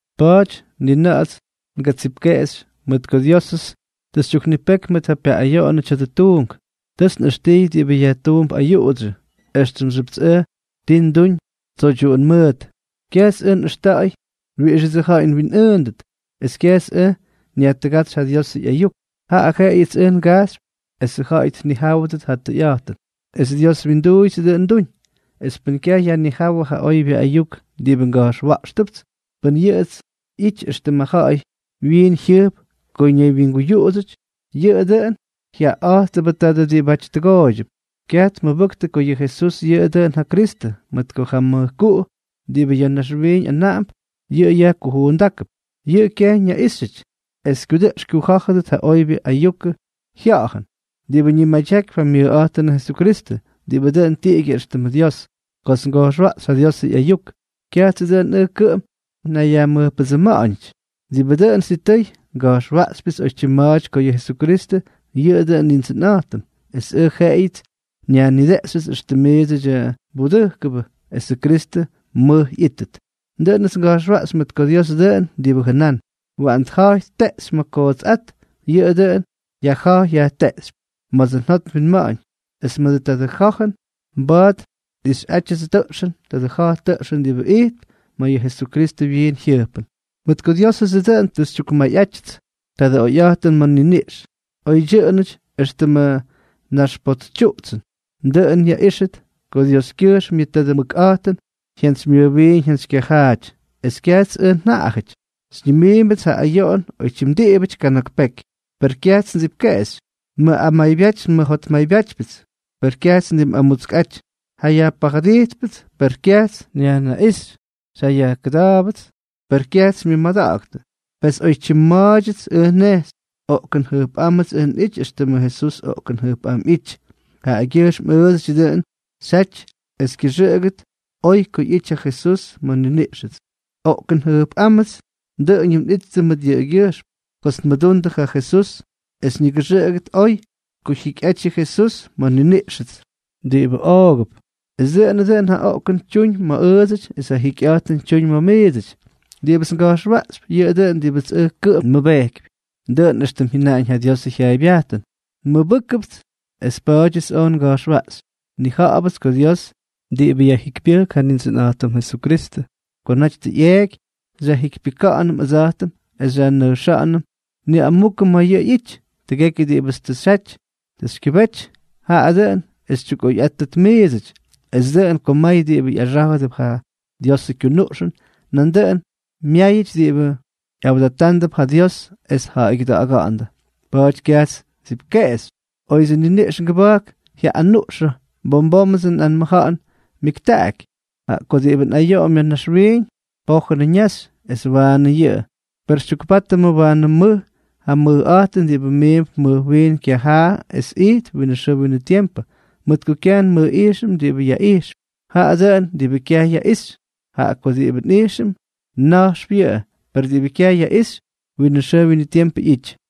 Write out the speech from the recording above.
Pa̱a̱ty ni na̱ꞌa̱ts ngatsipkeꞌexy, mʉt ko Diósʉts tʉ xytyuknipeky mʉt ja pyaꞌꞌayoꞌonʉ tya̱dʉ tuunk. Tʉts nꞌʉxtijy diꞌibʉ yajtuump ayuꞌudsyʉ, éxtʉmxyʉpts ʉj ti nduñ tsoydyuꞌun mʉʉt. Kyajts ʉj nꞌʉxta̱ꞌa̱y wiꞌixʉdsʉ ja̱ꞌa̱y nwinꞌʉʉndʉt, es kyajts ʉj nyajtʉgátsy ja Diosʉ ꞌyayuk; jaꞌa jeꞌeyʉts ʉj ngajxypy esʉ ja̱ꞌa̱y tnijáwʉdʉt ja tʉyꞌa̱jtʉn, es Dios wyinduuyʉts dʉꞌʉn nduñ. Es pʉn kyaj yajnijáwʉ ja oybyʉ ayuk diꞌibʉ nga̱jxwa̱ꞌxtʉpʉts, pʉn yuꞌutsy ꞌyity éxtʉmʉ ja̱ꞌa̱y wyiin jyʉjp ko ñaywyingujuuxyʉty, yʉꞌʉ dʉꞌʉn jyaꞌaꞌa̱jttʉbʉ taadʉ diꞌibáty tʉgooydyʉp. Kyaj tmʉbʉktʉ ko yʉ Jesús yʉꞌʉ dʉꞌʉn ja Kristʉ, mʉt ko ja mʉjkuꞌu diꞌibʉ ya̱ naxwiiñ anaꞌamp, yʉꞌʉ yajkujuundákʉp. Yʉꞌʉ kyaj ñaꞌíxyʉty es kyudʉꞌx kyujá̱jʉdʉt ja oybyʉ ayukʉ jya̱jʉn diꞌibʉ ñimadyakypy ja myʉjꞌa̱jtʉnʉ Jesukristʉ, diꞌibʉ dʉn tiꞌigyʉ éxtʉmʉ Dios. Kots nga̱jxwaꞌxy ja Diosʉ ꞌyayuk, kyajtsʉ dʉꞌʉn ʉj kʉꞌʉm nnayyajmʉjpʉdsʉma̱ꞌa̱ñʉty. Diꞌibʉ dʉn sitʉy, nga̱jxwaꞌxypyʉts oytyim ma̱a̱ty ko yʉ Jesukristʉ yʉꞌʉ dʉꞌʉnʉ Nindsʉnꞌa̱jtʉm, es ʉj jeꞌeyʉts nnayyajnideꞌxyʉty éxtʉm miidsʉdyʉ mbudʉjkʉbʉ esʉ Kristʉ mʉj ꞌyítʉt. Dʉꞌʉnʉts nga̱jxwaꞌxy mʉt ko Diosʉ dʉꞌʉn diꞌibʉ jʉnán: “Waꞌan tja̱jy tteꞌxy ma̱ ja kootsꞌát”, yʉꞌʉ dʉꞌʉn yajjajpy yajteꞌxypy ma̱dsʉ njot nwinma̱ꞌa̱ñ, es mʉdʉ tadʉ ja̱jʉn mba̱a̱t nꞌixyꞌátyʉts tadʉ ja̱j tʉꞌxʉn diꞌibʉ ijtp ma̱ yʉ Jesukristʉ wyiin jyʉjpʉn. Mʉt ko Diósʉdsʉ dʉꞌʉn tʉ xytyukmayꞌátyʉts tadʉ oyꞌa̱jtʉn ma̱ nniniꞌx, oydyʉꞌʉnʉty éxtʉmʉ naxpotsytyuꞌtsʉn, dʉꞌʉn yaꞌíxʉt ko Dioskyʉjxm yʉ tadʉ mʉkꞌa̱jtʉn jyantsymyʉjwiin jyantsykyajaaty, es kyajts ʉj njaꞌajʉty. Xyñimiimbʉts ja ayoꞌon oytyim diꞌibʉty kana̱k peky, per kyajts ndsipkeꞌexy; nmʉꞌamaybyáty nmʉjotmaybyátypyʉts, per kyajts ndimꞌamutskꞌaty; jayajpajʉdijtpʉts, per kyajts nyajnaꞌíxy; xyjayajkʉda̱a̱bʉts, per kyajts xymyʉmada̱ꞌa̱ktʉ. Pes oytyim ma̱a̱dyʉts ʉj nnejxy, oꞌkʉn jʉjpꞌámʉts ʉj nꞌity éxtʉmʉ Jesús oꞌkʉn jʉjpꞌám ꞌyijty. Jaꞌagyʉjxm ʉʉdsʉty dʉꞌʉn xyjaty es kyʉxʉꞌʉgʉt oy ko ꞌyity ja Jesús ma̱ nniniꞌxʉts. Oꞌkʉn jʉjpꞌámʉts dʉꞌʉñʉm nꞌittʉ mʉt yʉꞌʉgyʉjxm kots nmʉdundʉ ja Jesús es ñigʉxʉꞌʉgʉt oy ko jyikyꞌaty yʉ Jesús ma̱ nniniꞌxʉts diꞌibʉ oogʉp. Es dʉꞌʉnʉ dʉꞌʉn ja oꞌkʉn tyuñ ma̱ ʉʉdsʉty, es ja jikyꞌa̱jtʉn tyuñ ma̱ miidsʉty. Diꞌibʉts nga̱jxwaꞌxypy, yʉꞌʉ dʉꞌʉn diꞌibʉts ʉj kʉꞌʉm nmʉbejkypy, dʉꞌʉn éxtʉm jyʉnaꞌañ ja Diosʉ jyaaybyajtʉn: “Nmʉbʉjkʉts, es pa̱a̱dyʉts oj nga̱jxwaꞌxy.” Nnija̱ꞌa̱bʉts ko Dios diꞌibʉ yajjikypyʉjk ja Nindsʉnꞌa̱jtʉm Jesukristʉ ko naty tʉ ꞌyeeky, xyajjikypyʉka̱ꞌa̱nʉm ʉdsa̱jtʉm es xyajnʉjxa̱ꞌa̱nʉm niꞌamukʉ ma̱ yʉꞌʉ ꞌyity. Tʉgekyʉ diꞌibʉts tʉ xyjaty tʉ xykyʉbétyʉts, jaꞌa dʉꞌʉn es xytyukꞌoyꞌáttʉt miidsʉty, es dʉꞌʉn ko may diꞌibʉ ꞌyaxá̱jʉdʉp ja Diosʉ kyunuꞌxʉn, nandʉꞌʉn myáyʉty diꞌibʉ ꞌyawdatándʉp ja Dios es tja̱ꞌa̱ygyʉda̱ꞌa̱ga̱ꞌa̱ndʉ. Pa̱a̱ty kyajts ndsipkeꞌexy. Oyʉdsʉ nniniꞌx ngʉba̱jk jyaꞌꞌanuꞌxʉnʉ, bom bómʉdsʉ nꞌanmʉja̱ꞌa̱n myʉktaꞌaky. Jaꞌa ko diꞌibʉ nꞌayoꞌom ya̱ naxwiiñ, pojʉnʉꞌʉ ñaxy es waanʉ yʉꞌʉ; per xytyukpátʉm waanʉ mʉj ja mʉjꞌa̱jtʉn diꞌibʉ miimp mʉj wiin kyajaa es ijtp winʉ xʉʉ winʉ tiempʉ. Mʉt ko kyaj nmʉjꞌijxʉm diꞌibʉ yaꞌijxp, jaꞌa dʉꞌʉn diꞌibʉ kyaj yaꞌixy; jaꞌa ko diꞌibʉ nꞌijxʉm, na̱jxp yʉꞌʉ, per diꞌibʉ kyaj yaꞌixy, winʉ xʉʉ winʉ tiempʉ ꞌyity.